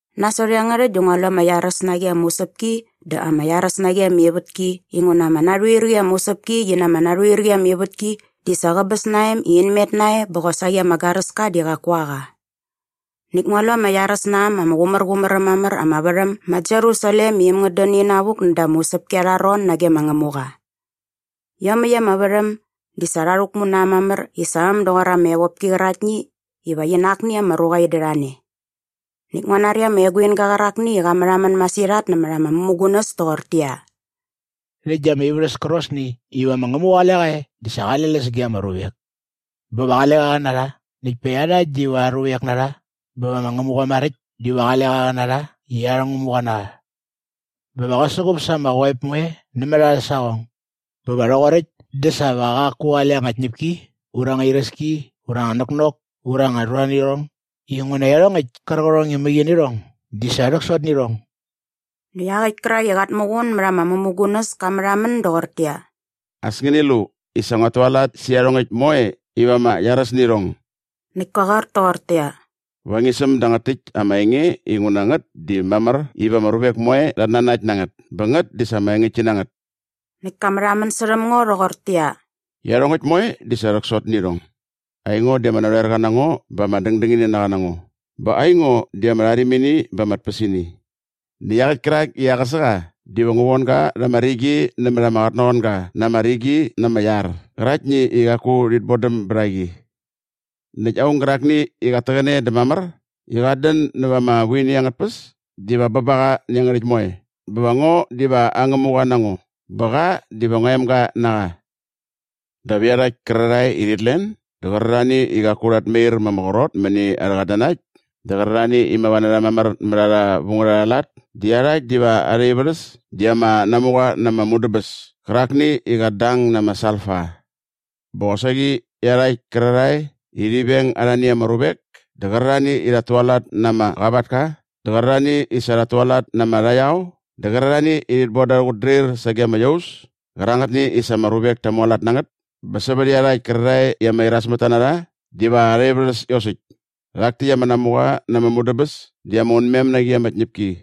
Nasot iangärhäkt dä ngua lu ama iaräs na qi ama usäpki dä ama iaräs na qi ama ivätki inguna ama narhuir qi ama usäpki qi na ama narhuir qi ama ivätki di sa qäbäs na em i in met nae bä qosaqi ama garäska di qaku a qa. Näkt ngua lu ama iaräs na äm ama qumärqumär äm mamär ama värhäm ma Jerusalem i äm ngät dän inavuk näda ama usäpki arha ron nage ma Ngämuqa. Iomäkt ama värhäm di sa rha rhäkmu na äm mamär i sa äm doqor ama evopki qäraktni iva qi na akni ama ruqa in dät a ne. Näkt ngua nari ama eguinga qärakni i qa märhamän masirhat nämät ama mämugunäs toqortäqyia, “Rhäkt di ama ivärhäs kärqosni iva ma Ngämuqa qale qa e di sa qale läs ge ama ruvek. Bä va qale qa qä na rha näkt pa iarhakt diva aa ruvek na rha bä va ma Ngämuqa maräkt diva qale qa qä na rha i arhä Ngämuqa na qa. Bä va qä suqup sa ama qoep moe nämät arhä saqong. Bä va rhoqoräkt dä sa va qaku qale anga tñäpki ura anga iräski ura anga näknok ura anga ruanirhong inguna iarhongäkt kärqärhong i mäqi nä irhong di sa rhäksot nä irhong.” Näkt iaqäkt kärak i qat muqun mät ama mämugunäs ka märhamän doqortäqyia, “As ngäni lu i sa nguat tualat sä iarhongäkt moe iva ama iaräs nä irhong!” Näkt ka qoar toqortäqyia, “Va ngi säm dangät täkt ama enge inguna ngät di mamär iva ama ruvek moe rhat nanakt na ngät bä ngät di sa ama engäktki na ngät.” Näkt ka märhamän särhäm ngo rhoqortäqyia, “Iarhongäkt moe di sa rhäksot nä irhong! Aingo di ama narhoerqa na ngo bä ama dängdängininaqa na ngo bä aingo di ama rharimini bä ama tpäsini. Näkt iaqäkt kärak i aqäsä qa diva ngu von ga rha ama rigi nämät ama qotnaqoanga na ama rigi na ama iar qäraktni i qaku rhit bodäm bät a qi. Näkt aung gärakni i qat täqäne dä mamär i qat dän näva ama vuini angät tpäs diva bä ba qa nä iangärhäkt moe bä va ngo diva aa Ngämuqa na ngo bä qa diva ngua emga na qa. “Dap iarhakt kärarhae i rhit len dä qärarhani i qaku rhat mair ma ama qrot mäni arhä qatnanakt dä qärarhani i mava na rha mamär mät arha vu ngät arha lat di iarhakt diva arha ivärhäs di ama namuqa na ama mudäbäs kärakni i qat dang na ama salfa. Bä qosaqi iarhakt kärarhae i rhi veng arhani ama ruvek dä qärarhani i rhat tualat na ama qavatka dä qärarhani i sa rhat tualat na ama rhaqyao dä qärarhani i rhit bon da arhä qutdrir sage ama iaus kärangätni i sa ama ruvek ta mualat na ngät bä sävät iarhakt kärarhae i ama irasmätta na rha diva arha ivärhäs iosäkt. Rhak täkt ama namuqa na ama mudäbäs di ama unmem na qi ama tñäpki.”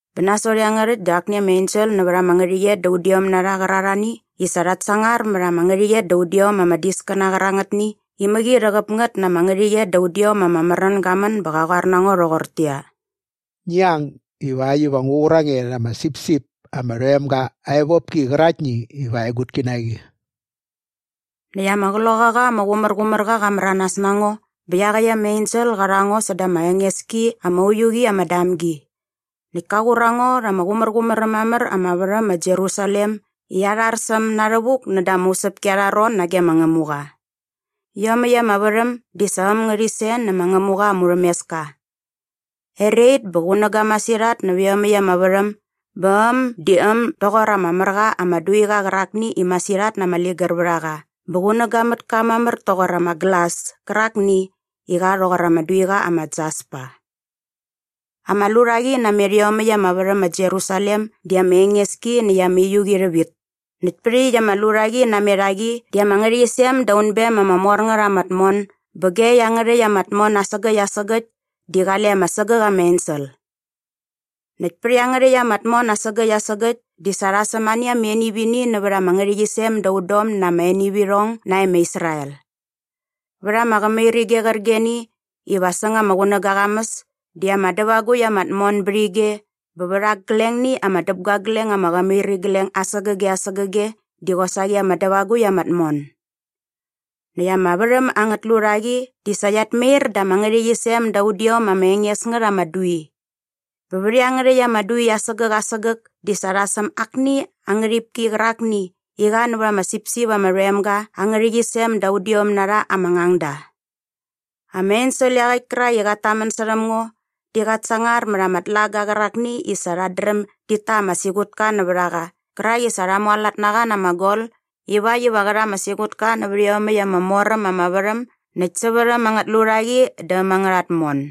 Bä nasot iangärhäkt dä akni ama ensel nävät ama ngärhäqyet da udiom na rha qärarhani i sa rhat sangar mät ama ngärhäqyet da udiom ama diskäna qärangätni i mäqi rhäqäp ngät na ama ngärhäqyet da udiom ama märän ga män bä qa qoar na ngo rhoqortäqyia, “Ngi ang ivakt iva ngu qur a nge rha ama sipsip ama rhoem ga aa evopki qäraktni iva aa egutki na qi.” Näkt ama Qloqaqa ama Qumärqumärqa qa märanas na ngo bä iaqäkt ama ensel qa rha ngo bä säda ama enges ki ama uiu qi ama damgi. Näkt ka qur a ngo rha ama qumärqumär äm mamär ama värhäm ma Jerusalem i arhar sä äm na rhävuk näda ama usäpki arha ron nage ma Ngämuqa. Iomäkt ama värhäm di sa äm ngärhit sen nä ma Ngämuqa aa murhämeska. Erait bä qunäga masirhat nävät iomäkt ama värhäm bä äm di äm doqor ama mär qa ama duiqa qärakni i masirhat na ama ligär vät a qa bä qunäga mät ka mamär toqor ama glas kärakni i qa rhoqor ama duiqa ama jaspa. Ama lurhaqi namet iomäkt ama värhäm ma Jerusalem di ama enges ki näkt ama uiu qi rhävit. Näkt pät iaqyäkt ama lurhaqi namet a qi di ama ngärhäqyisem da unbem ama mor ngät ama tmon bä ge iangärhäkt ama tmon asägäkt asägäkt di qale ama sägäk ama ensel. Näkt pät iangärhäkt ama tmon asägäkt asägäkt di sa rha säm ani ama enivini nävät ama ngärhäqyisem da udom na ama enivirhong nae ma Israel. Vät ama qämirige qärqigeni iva säng ama qunäga aa qamäs di ama dävagukt ama tmon bät ige bä vät aglengni ama däpguagleng ama qämirigleng asägäge asägäge di qosaqi ama dävagukt ama tmon. Näkt ama värhäm angät lurhaqi di sa qiat mair da ama ngärhäqyisem da udiom ama enges ngät ama dui. Bä vät iangärhäkt ama dui asägäk asägäk di sa rha säm akni aa ngärhipki qärakni i qa nävät ama sipsip ama rhoem ga aa ngärhäqyisem da udiom na rha ama ngangda. Ama ensel iaqäkt kärak i qat tamän särhäm ngo di qat sangar mät ama tlaga qärakni i sa rhat dräm dit ta ama siqutka nävät a qa qärak i sa rha mualat na qa na ama gol ivakt iva qä rha ama siqutka nävät iomäkt ama mor äm ama värhäm näkt sävät äm angät lurhaqi dä äm angärha tmon.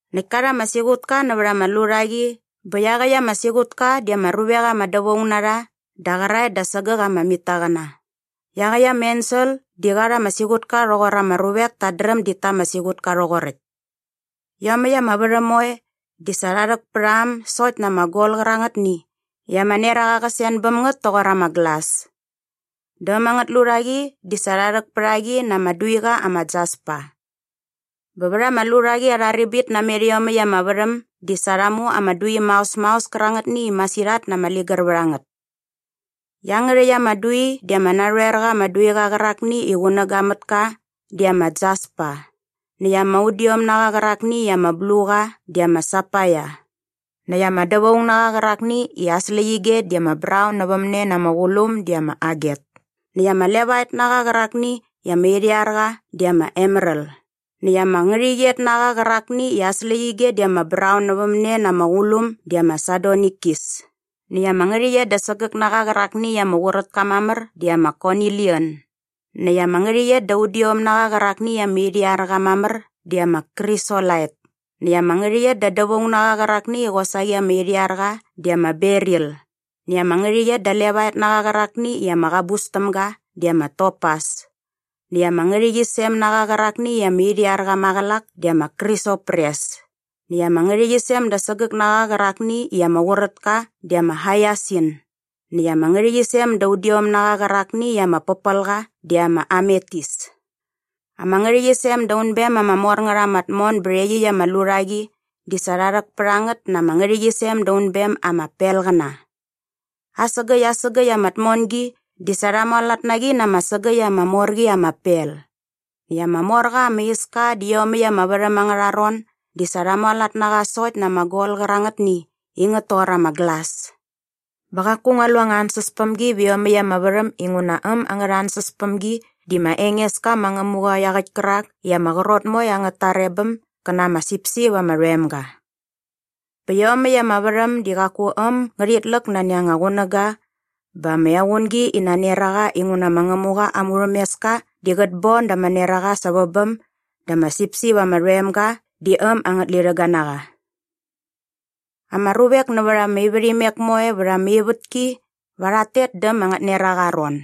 Näkt ka rha ama siqutka nävät ama lurhaqi bä iaqäkt ama siqutka di ama ruvek ama dävaung na rha da qäraet da sägäk ama mitaqäna. Iaqäkt ama ensel di qa rha ama siqutka rhoqor ama ruvek tat dräm dit ta ama siqutka rhoqoräkt. Iomäkt ama värhäm moe di sa rha rhäk pät a äm sokt na ama gol qärangätni i ama neraqa qä sen bäm ngät toqor ama glas. Dä äm angät lurhaqi di sa rha rhäk pät a qi na ama duiqa ama jaspa. Bä vät ama lurhaqi arha ribit namet iomäkt ama värhäm di sa rha mu ama dui maos maos kärangätni i masirhat na ama ligär vät a ngät. Iangärhäkt ama dui di ama narhoer qa ama duiqa qärakni i qunäga mät ka di ama jaspa näkt ama udiom na qa qärakni i ama blu qa di ama sapaia näkt ama dävaung na qa qärakni i aa släqyige di ama braun nävämne na ama qulum di ama aget näkt ama levaet na qa qärakni i ama irhiar qa di ama emeral näkt ama ngärhäqyet na qa qärakni i aa släqyige di ama braun nävämne na ama qulum di ama sadonikis näkt ama ngärhäqyet da sägäk na qa qärakni i ama qurät ka mamär di ama konilian näkt ama ngärhäqyet da udiom na qa qärakni i ama irhiar qa mamär di ama krisolait näkt ama ngärhäqyet da dävaung na qa qärakni i qosaqi ama irhiar qa di ama beril näkt ama ngärhäqyet da levaet na qa qärakni i ama qabus täm ga di ama topas näkt ama ngärhäqyisem na qa qärakni i ama irhiar qa maqälak di ama krisopres näkt ama ngärhäqyisem da sägäk na qa qärakni i ama qurät ka di ama haiasin näkt ama ngärhäqyisem da udiom na qa qärakni i ama pärpäl qa di ama ametis. Ama ngärhäqyisem da unbem ama mor ngät ama tmon bät iaqyäkt ama lurhaqi di sa rha rhäk pät a ngät na ama ngärhäqyisem da unbem ama pelqäna. Asägäkt asägäkt ama tmongi di sa rha mualat na qi na ama sägäkt ama mor qi ama pel. Näkt ama mor qa ama iska dä iomäkt ama värhäm angärha ron di sa rha mualat na qa sokt na ama gol qärangätni i ngät toqor ama glas. Bä qaku ngua lu anga ansäspämgi vä iomäkt ama värhäm inguna äm angärha ansäspämgi di ma Engeska ma Ngämuqa iaqäkt kärak i ama qrot moe angät tarebäm gä na ama sipsip ama rhoem ga. Bä iomäkt ama värhäm di qaku äm ngärhit läk nani ama qunäga bä ama equngi ina neraqa inguna ma Ngämuqa aa murhämeska di qät bon da ama neraqa sävä bäm dä ama sipsip ama rhoem ga di äm angät lirhäga na qa. Ama ruvek nävät ama ivärhimek moe vät ama ivätki va rhat tet dä äm angät neraqa aa ron.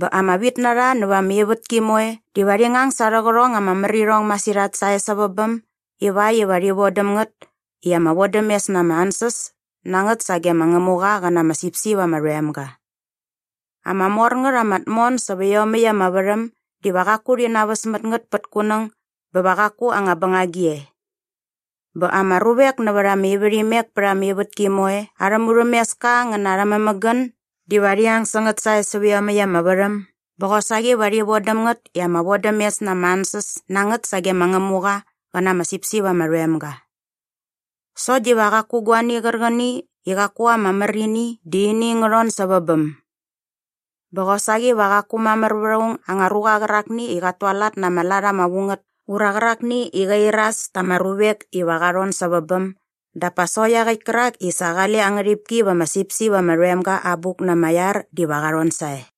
Bä ama vitnarha nävät ama ivätki moe diva rhi ngang sa arhä qärhong ama mär irhong masirhat sae sävä bäm ivakt iva rhi vodäm ngät i ama vodämes na ama ansäs na ngät sage ma Ngämuqa qä na ama sipsip ama rhoem ga. Ama mor ngät ama tmon sävä iomäkt ama värhäm diva qaku rhi naväs mät ngät pät kunäng bä va qaku anga bängagi e. Bä ama ruvek nävät ama ivärhimek pät ama ivätki moe arhä murhämeska ngä na arhä mämägän diva rhi ang sä ngät sae sävä iomäkt ama värhäm bä qosaqi va rhi vodäm ngät i ama vodämes na ama ansäs na ngät sage ma Ngämuqa qä na ama sipsip ama rhoem ga. Sokt diva qaku guani qärqäni i qaku ama mär ini di ini ngä rhon sävä bäm. Bä qosaqi va qaku mamär vät aung anga ruqa qärakni i qat tualat na ama lat ama vu ngät ura qärakni qä iras ta ama ruvek iva qa rhon sävä bäm dap pa sokt iaqäkt kärak i sa qale aa ngärhipki va ama sipsip ama rhoem ga aa abuk na ama iar diva qa rhon sae.